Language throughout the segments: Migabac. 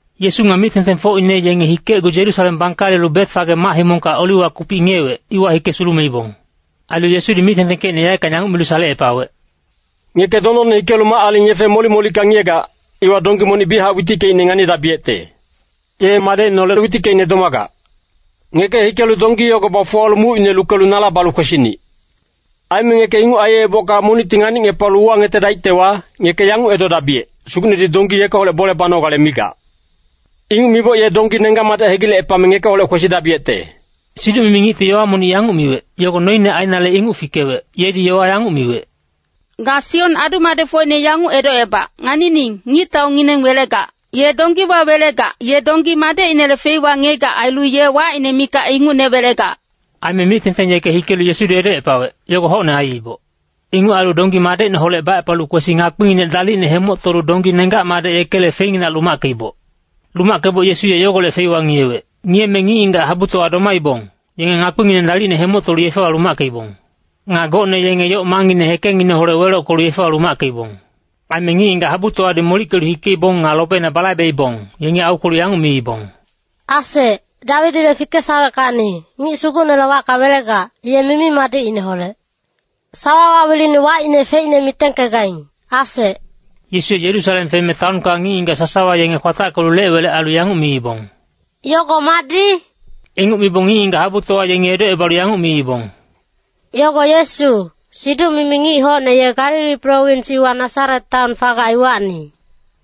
Yesu nga mic-tengtengfocine yenge hikecgu Yerusalem bangkalelu Betfage mac-himongka Oliwa kupic ngiyewec, iwa hike sulumeibong. Ailu Yesudi mic-tengtengkecine yaeckang yanguc milu salecepawec, “Ngeke dondonne hikelu mac-aling yefe molic-molicka ngiyegac, iwa donggi monic biyachac witickeicne nganidabiyecte. Ye madecineholec witickeicne domagac. Ngeke hikelu donggi yogo bafuwalu mucine lukelu nala balu kwesinic. Aime ngeke inguc aiyebocka monicti nganicngepalu uwangetedaictewa, ngeke yanguc edodabiyec, ‘Sugucnedi donggi yekeholec bole banogale migac.’ Inguc miboc ye donggi nenggac-madec hegilecepame ngekeholec kwesidabiyecte.” Siduc-mimi ngicti yowa monic yanguc miwec, yogo noine ainale inguc fikewec, yedi yowa yanguc miwec, “Ga Sion adu-madecfocine yanguc edocebac, ‘Nganining, ngictaungineng welegac. Ye donggiwa welegac, ye donggi madecinele feiwa ngiyegac ailu ye wacine mikac ingucne welegac.’” Aime mic-tengteng yeke hikelu Yesudi edocepawec, yogo hocne aiiboc. Inguc ailu donggi madecineholec bacepalu kwesi ngakpinginec dalicne hemoctolu donggi nenggac-madec yekele feinginac lumackeiboc. Lumackeboc Yesu ye yogolec feiwa ngiyewec. Ngiyeme ngic-ngigac habutowa domaibong, yenge ngakpingineng dalicne hemoctolu yefewa lumackeibong. Nga gocne yenge yoc mangngine hekengngineholec welockelu yefewa lumackeibong. Aime ngic-ngigac habutowadi molickelu hikeibong nga lobeina balaibeibong, yengi aukwelu yanguc miibong, “ ‘Asec, Dawidile fikesaweckacni, Ngic Sugucnele wacka welegac, ye mimi-madicineholec.’ Sawawa wilini wacine feicne mitengkegaing, asec.” Yesu ye Yerusalem feme taonka ngic-ngigac sasawa yenge kwatackelu lec-welec ailu yanguc miibong, “Yogo madi?” Inguc mibong ngic-ngigac habutowa yengi edocebalu yanguc miibong, “Yogo Yesu, siduc-mimi ngic hocne ye Galili prowins iwa Nasaret taon fagac iwacni.”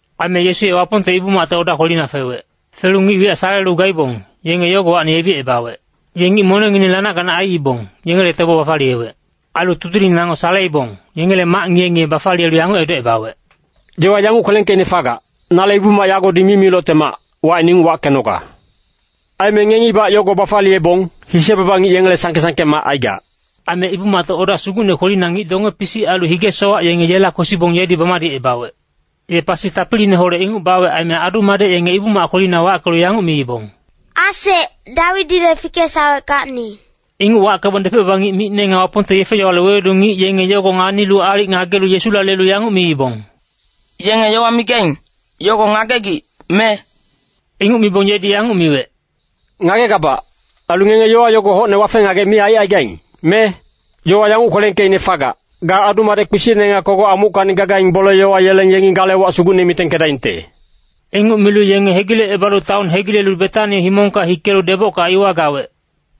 Aime Yesu ye Wapongte Ibu-macte oda kwelina fewec. Felu ngic wiyac salelu gaibong, yenge yogowacni yebicebawec. Ye ngic monengngineng lanac-ganac aiibong, yengele tebo bafaliyewec. Ailu tudiling nango saleibong, yengele mac ngiye-ngiye bafaliyelu yanguc edocebawec, “Yowa yanguc kwelengkeicne fagac, ‘Nale Ibu-mac yagodi mimilocte mac, wacine inguc wackenoga.’ Aime ngengibac yogo bafaliyebong, ‘Hise-baba ngic yengele sangke-sangke mac aigac.’” Aime Ibu-macte oda sugucne kwelina ngic donge-pisic ailu hige-sowac yenge yela kwesibong yedi bamadicebawec. Ye pasi tapiliineholec inguc bawec aime adu-madec yenge Ibu-mac kwelina wackelu yanguc miibong, “Asec, Dawidile fikesaweckacni.” Inguc wackebong depec-baba ngic micne nga Wapongte yefe-yowale wewedu ngic yenge yogo nganilu aalic ngagelu Yesula lelu yanguc miibong, “Yenge yowa migaing, yogo ngagegic, me?” Inguc mibong yedi yanguc miwec, “Ngagegabac, ailu ngenge yowa yogo hocne wafe-ngagec mi aicaigaing, me? Yowa yanguc kwelengkeicne fagac, ‘Ga adu-madec kpisicne nga kogoc amuckacni gagaing bole-yowa yeleng yengi gale wac sugucne mitengkedaingte.’” Inguc milu yenge hegilecebalu taon hegilelu Betani himongka hikelu debocka iwa gawec.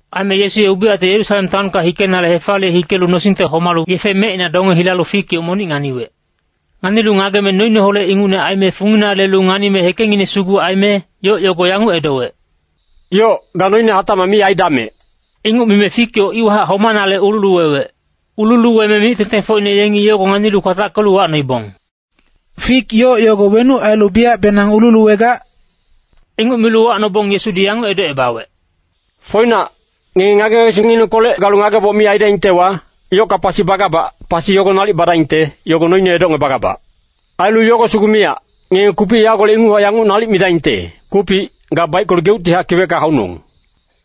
Aime Yesu ye ubiyacte Yerusalem taonka hikenale hefaliye hikelu nosingte homalu yefe mecina donge hilalu fik yoc monic nganiwec. Nganilu ngageme noineholec ingucne aime fungina lelu nganime hekengngine sugu aime, yoc yogo yanguc edowec, “Yoc, ga noine hatacmac mi aidamec.” Inguc mime fik yoc iwahac homanale ululuwewec. Ululuweme mic-tengtengfocine yengi yogo nganilu kwatackelu uwacnoibong, “Fik yoc yogo wenuc ailu biyacbenang ululuwegac?” Inguc milu uwacnobong Yesudi yanguc edocebawec, “Foinac, ngenge ngage-ngagesingnginengkolec galu ngageboc mi aidaingtewa, yocka pasi bagabac, pasi yogo nalic badaingte, yogo noine edocngebagabac. Ailu yogo sugu miyac, ngenge kupic yagolec inguchac yanguc nalic midaingte, ‘Kupic, ga baickelu geuctihac kiwecka haunong.’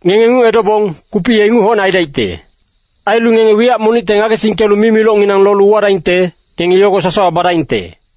Ngenge inguc edobong, kupic ye inguc hocne aidaicte. Ailu ngenge wiyac monicte ngagesingkelu mimilocnginang lolu uwadaingte, ngenge yogo sasawa badaingte.”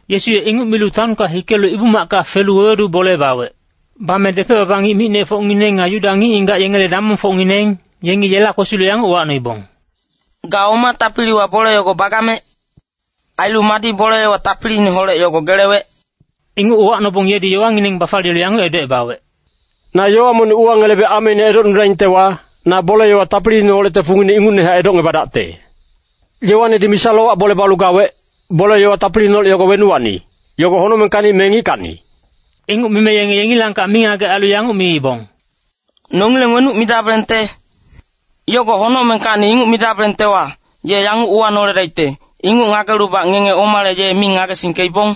Yesu ye inguc milu taonka hikelu Ibu-macka felu wewedu bole bawec. Bame depec-baba ngic micnefocngineng nga Yuda ngic-ngigac yengele damongfocngineng, yengi yela kwesilu yanguc uwacnoibong, “Ga oma tapiliwa bole yogo bagamec? Ailu madi bole-yowa tapiliineholec yogo gelewec?” Inguc uwacnobong yedi yowangineng bafaliyelu yanguc edocebawec, “Na yowa monic uwangelebe ameine edocnudaingtewa, na bole-yowa tapiliineholecte fungine ingucnehac edocngebadacte. Yoanedi misa-lowac bole balu gawec, bole-yowa tapiliineholec yogo wenuwacni, yogo honocmengkacni me ngickacni?” Inguc mime yenge yengilangkac mingagec ailu yanguc miibong, “Nongileng wenuc midabelengte? ‘Yogo honocmengkacni’ inguc midabelengtewa, ye yanguc uwanoledaicte, ‘Inguc ngagelubac ngenge omale ye mi ngagesingkeibong?’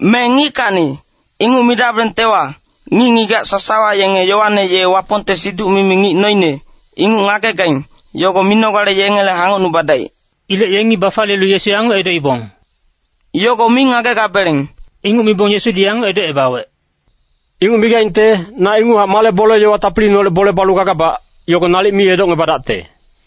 Me ‘ngickacni,’ inguc midabelengtewa, ngic-ngigac sasawa yenge Yoane ye Wapongte siduc-mimi ngic noine, inguc ngagegaing, yogo minogale yengele hangocnubadaic.” Ilec yengi bafaliyelu Yesu yanguc edoibong, “Yogo mi ngagegabeleng.” Inguc mibong Yesudi yanguc edocebawec, “Inguc migaingte, na inguchac male bole-yowa tapiliineholec bole balu gagabac, yogo nalic mi edocngebadacte.”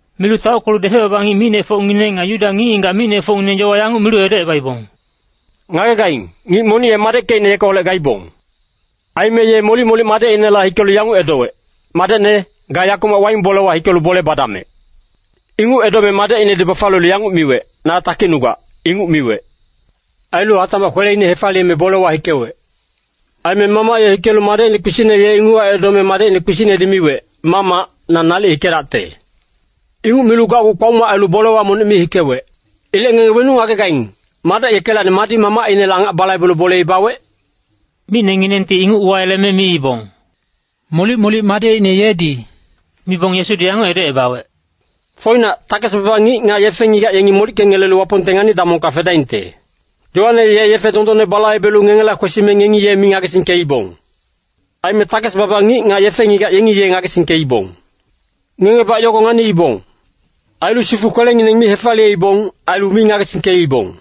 Milu taockelu depec-baba ngic micnefocngineng nga Yuda ngic-ngigac micnefocngineng yowa yanguc milu edocebawec, “Ngagegaing, ngic monic ye madeckecine yekeholec gaibong. Aime ye molic-molic madecinela hikelu yanguc edowec, ‘Madecne, ga yakumac waing bolewa hikelu bole badamec.’ “Inguc edome madecinedi bafaliyelu yanguc miwec, ‘Na takicnugac,’ inguc miwec. Ailu hatacmac kweleine hefaliyeme bolewa hikewec. “Aime mamac ye hikelu madecine kpisicne ye inguchac edome madecine kpisicnedi miwec, ‘Mamac, na nalic hikedacte.’ Inguc milu gacgu kpaoma ailu bolewa monic mi hikewec. “Ilec ngenge wenuc ngagegaing, madec yekelacni madi mamacinele angac balaibelu boleine bawec?” Micnenginengti inguc uwayeleme miibong, “Molic-molic madecine yedi.” Mibong Yesudi yanguc edocebawec, “Foinac, takes-baba ngic nga yefe-ngigac yengi molickengelelu Wapongte ngani-damongka fedaingte. Yoane ye yefe dondonne balaibelu ngengela kwesime ngengi ye mi ngagesingkeibong. Aime takes-baba ngic nga yefe-ngigac yengi ye ngagesingkeibong. Ngengebac yogo nganiibong. Ailu sifu kwelengineng mi hefaliyeibong, ailu mi ngagesingkeibong.”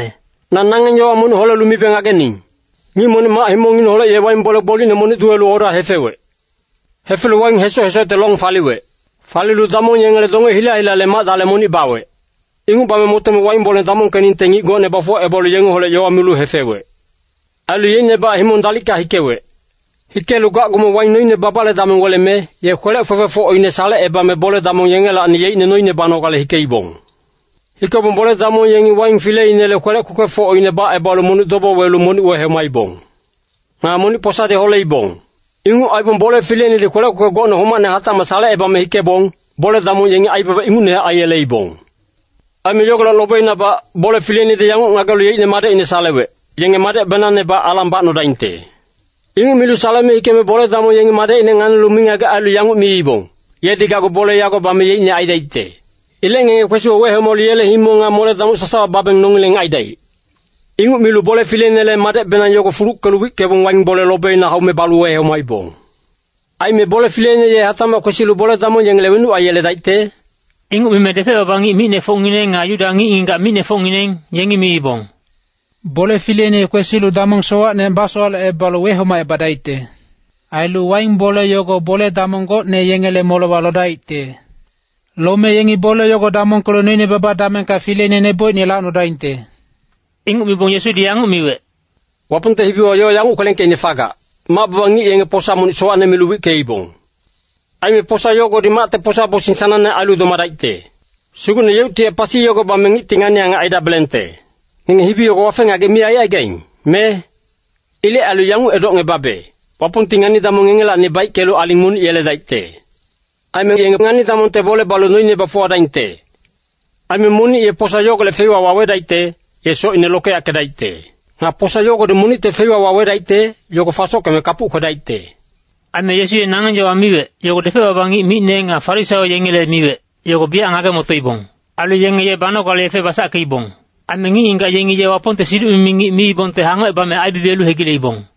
“Na nangeng yowa monic holelu mibe ngagening. Ngic monic mac-himongngineholec ye waing bole gbolicne monic duwelu oda hefewec. Hefelu waing hesoc-hesocte long faliwec. Falilu damong yengele donge hila-hilale mac-dale monic bawec. Inguc bame motome waing bole damongkeningte ngic gocne bafuwacebalu yengeholec yowa milu hefewec. Ailu yeicnebac himong dalicka hikewec. Hikelu gacgume waing noine babale dameng weleme, ye kwelec kwekwefocine salecebame bole-damong yengelacni yeicne noine banogale hikeibong. “Hikebong bole-damong yengi waing fileinele kwelec kwekwefocine bacebalu monic dobo welu monic wehomaibong. Nga monic posadi holeibong. Inguc aibong bole fileinedi kwelec kwekwe gocne homacne hatacmac salecebame hikebong, bole-damong yengi aibaba ingucnehac aiyeleibong. Aime yogolec lobeinabac, bole fileinedi yanguc ngagelu yeicne madecine salewec, ‘Yenge madecnebenangbac alang bacnodaingte.’ “Inguc milu saleme hikeme bole-damong yengi madecine nganilu mingagec ailu yanguc miibong, ‘Yedi gacgu bole yago bame yeicne aidaicte. Ilec ngenge kwesibong wehomalu yele himong nga mole-damoc sasawa baebengka nongileng aidaic.’ Inguc milu bole fileinele madecbenang yogo fuluckelu wickebong waing bole lobina haume balu wehomaibong. “Aime bole fileine ye hatacmac kwesilu bole-damong yengele wenuc aiyeledaicte?” Inguc mime depec-baba ngic micnefocngineng nga Yuda ngic-ngigac micnefocngineng, yengi miibong, “Bole fileine ye kwesilu damong sowacne basowalecebalu wehomacebadaicte. Ailu waing bole yogo bole-damong gocne yengele molewa lodaicte. Lome yengi bole yogo damongkelu noine baba damengka fileine nebocine lacnodaingte.” Inguc mibong Yesudi yanguc miwec, “Wapongte hibiwa yowa yanguc kwelengkeicne fagac, ‘Mac-baba ngic yenge posa monic sowacne milu wickeibong. Aime posa yogodi macte posa-bosing sanangne ailu domadaicte. Sugucne yeuctihac pasi yogo bame ngicti ngani-angac aidabelengte.’ Ngenge hibi yogo wafe-ngagec mi aicaigaing, me? “Ilec ailu yanguc edocngebabe, Wapongti ngani-damong ngengelacni baickelu aling monic yeledaicte. Aime yenge ngani-damongte bole balu noine bafuwadaingte. Aime monic ye posa yogolec feiwa wawedaicte, ye socine lokeyackedaicte. Nga posa yogodi monicte feiwa wawedaicte, yogo fasosockeme kapuc kwedaicte.” Aime Yesu ye nangeng yowa miwec, yogo depec-baba ngic micne nga Farisaio yengele miwec, yogo biyac ngage-motoibong. Ailu yenge ye banogale yefe basackeibong. Aime ngic-ngigac yengi ye Wapongte siduc-mimi ngic miibongte hangocebame aibibiyelu hegileibong.